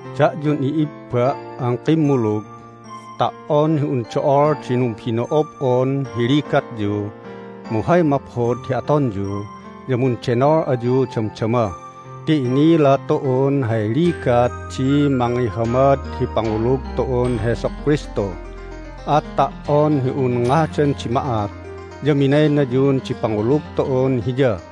Da'yun i'ibba' an kimmulug, ta"on hi un do'ol di numbino'ob'on hi ligatyu mu hay maphod hi atonyu ya mundenol ayu damdama ti inila tu'un hay ligat di mangihamad hi pangulug tu'un Jesu Kristu, at ta"on hi un ngadan di ma'at ya minaynayun di pangulug tu'un Hiya.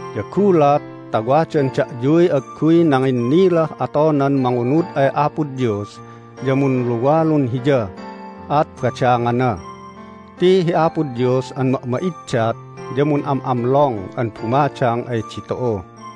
Ya gulat ta wadan da'yuy agguy nanginnilah atonan mangunud ay Apo Dios ya munluwalun Hiya, at badangana. Ti hi Apo Dios an ma'ma'iddat ya mun'am'amlong an bumadang ay ditu'u.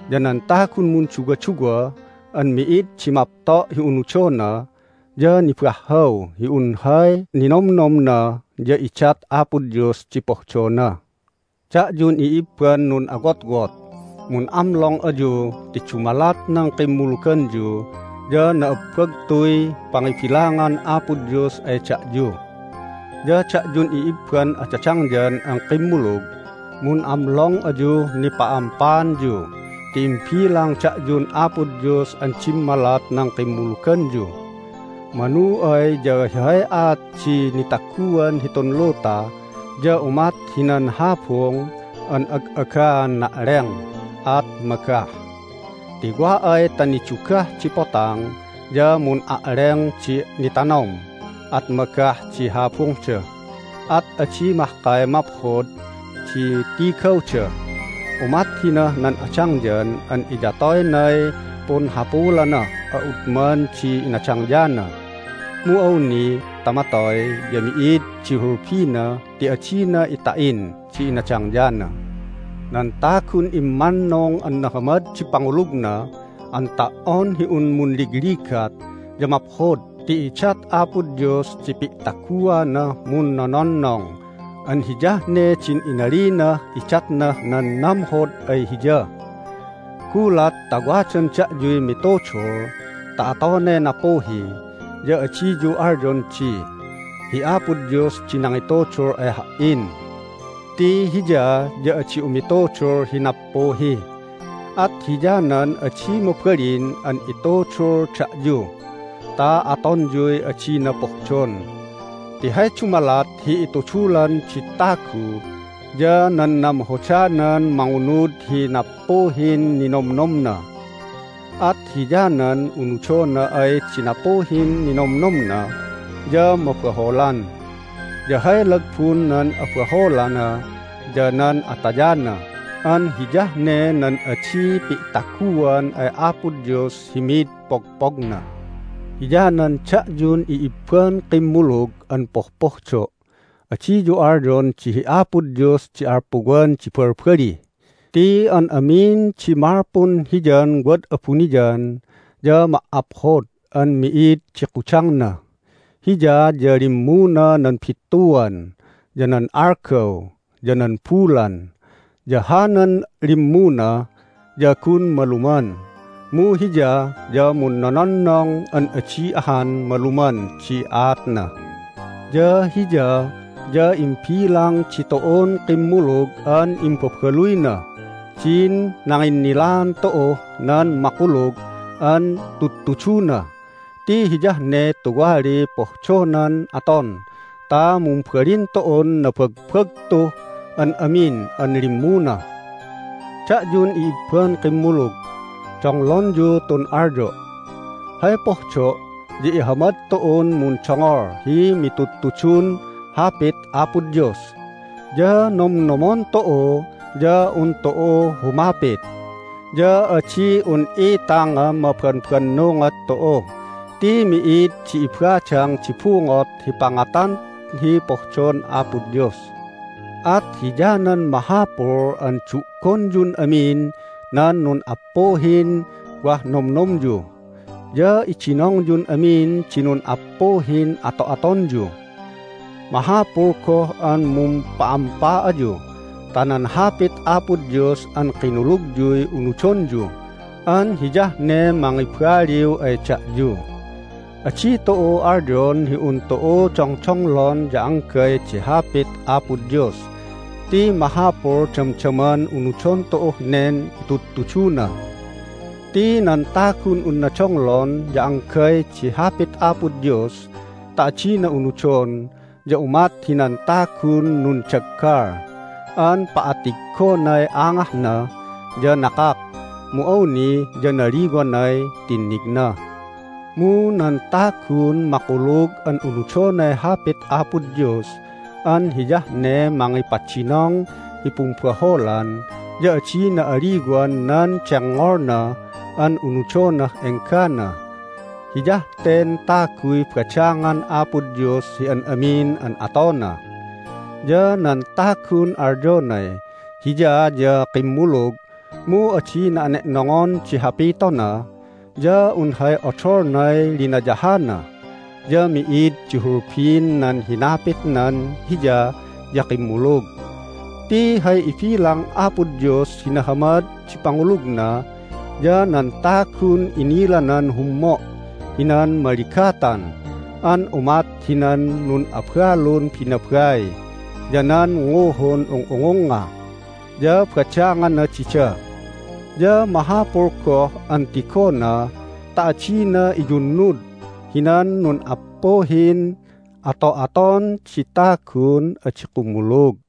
Ya nan tagun munduwaduwa an mi'id di mapto' hi unudona ya nibahhaw hi un hay ninomnomna ya idat Apo Dios di pohdona. Da'yun i'ibban nun'awotwot, mun'amlong ayu ti dumalat nan kimmuluganyu ya na'abbagtuy pangibilangan Apo Dios ay da'yu. Ya da'yun i'ibban adadangyan an kimmulug, mun'amlong ayuh nipa'ampaanyu ti imbilang da'yun Apo Dios an dimmalat nan kimmuluganyu. Manu ay ya hay aat di nitaguan hitun luta ya umat hinan habung an ag'agaan na'leng, at magah. Ti wa ay ta nidugah di potang ya mun'a'leng di nitanom at magah di habungda, at adi mahkay maphod di tigawda. Umat hinah nan adangyan an iyatoynay punhapulanah a'udman di inadangyana, mu awni ta matoy ya mi'id di hulbina ti adina ita'in di inadangyana. Nan tagun immannung an nahamad di pangulugna an ta"on hi un munligligat ya maphod ti idat Apo Dios di pi'taguanah munnononnong an hiyah ne din inalinah idatnah nan namhod ay Hiya. Gulat ta wadan da'yuy mitudul ta atonay nappuhi ya adiyu alyon di, "Hi Apo Dios di nangitudul ay ha"in!" Ti Hiya ya adi umitudul hi nappuhi, at hiyanan adi mabalin an itudul da'yu ta atonyuy adina pohdon. Ti hay dumalat hi itudulan di tagu ya nan namhodanan mangunud hi nappuhin ninomnomna. At hiyanan unudona ay di nappuhin ninomnomna ya mabaholan, ya hay lagbun nan abaholana ya nan atayana an hiyah ne nan adi pi'taguan ay Apo Dios hi mid pogpogna. Hiyanan da'yun i'ibban kimmulug an pohpohdo', adiyu alyon di hi Apo Dios di alpuwan di balbali ti an amin di malpun Hiyan wad abuniyan ya ma"aphod an mi'id di kudangna. Hiya ya limmuna nan bittuan, ya nan algaw, ya nan bulan. Ya hanan limmuna ya gun maluman, mu Hiya ya munnononnong an adi ahan maluman di aatna. Ya Hiya ya imbilang ditu'un kimmulug an imbabaluynah din nanginnilaan tu'uh nan makulug an tudtuduna ti hiyah ne tuwaliy pohdonan aton ta mumbalin tu'un nabagbagtuh an amin an limmuna. Da'yun i'ibban kimmulug, donglonyu tun alyo'. Hay pohdo' ya ihamad tu'un mundongol hi mitudtudun Hapit Apo Dios, ya nomnomon tu'u ya un tu'u humapit. Ya adi un itangan mabanbanungot tu'u ti mi'id di ibadang di bungot hi pangatan hi pohdon Apo Dios. At hiyanan mahapul an du'gonyun amin nan nun'appuhin wah nomnomyu, ya idinongyun amin di nun'appuhin ato'atonyu. Mahapul goh an mumpa'ampa ayu ta nan Hapit Apo Dios an kinulugyuy unudonyu an hiyah ne mangibaliw ay da'yu. Adi tu'u alyon hi un tu'u dongdonglon ya anggay di Hapit Apo Dios ti mahapul damdaman unudon tu'uh nen itudtuduna. Ti nan tagun unna donglon ya anggay di Hapit Apo Dios ta adina unudon ya umat hinan tagun nundaggal an pa'attigonay angahna, ya nakak, mu awni ya naliwanay tinnigna. Mu nan tagun makulug an unudonay Hapit Apo Dios an hiyah ne mangipadinong hi pumbaholan ya adina aliwan nan dengngolna an unudonah enggana. Hiyah ten taguy badangan Apo Dios hi an amin an atona. Ya nan tagun alyonay hiya ya kimmulug mu adina ane'nongon di hapitona ya un hay odolnay linayahana, ya mi'id di hulbin nan hinapitnan hiya ya kimmulug. Ti hay ibilang Apo Dios hi nahamad di pangulugna ya nan tagun inilanan hummo' hinan maligatan an umat hinan nun'abalun binabai ya nan nguhun ung'ungungnga, ya badangana dida. Ya mahapul goh an tigona ta adina iyunnud hinan nun'appuhin ato'aton di tagun adi kumulug.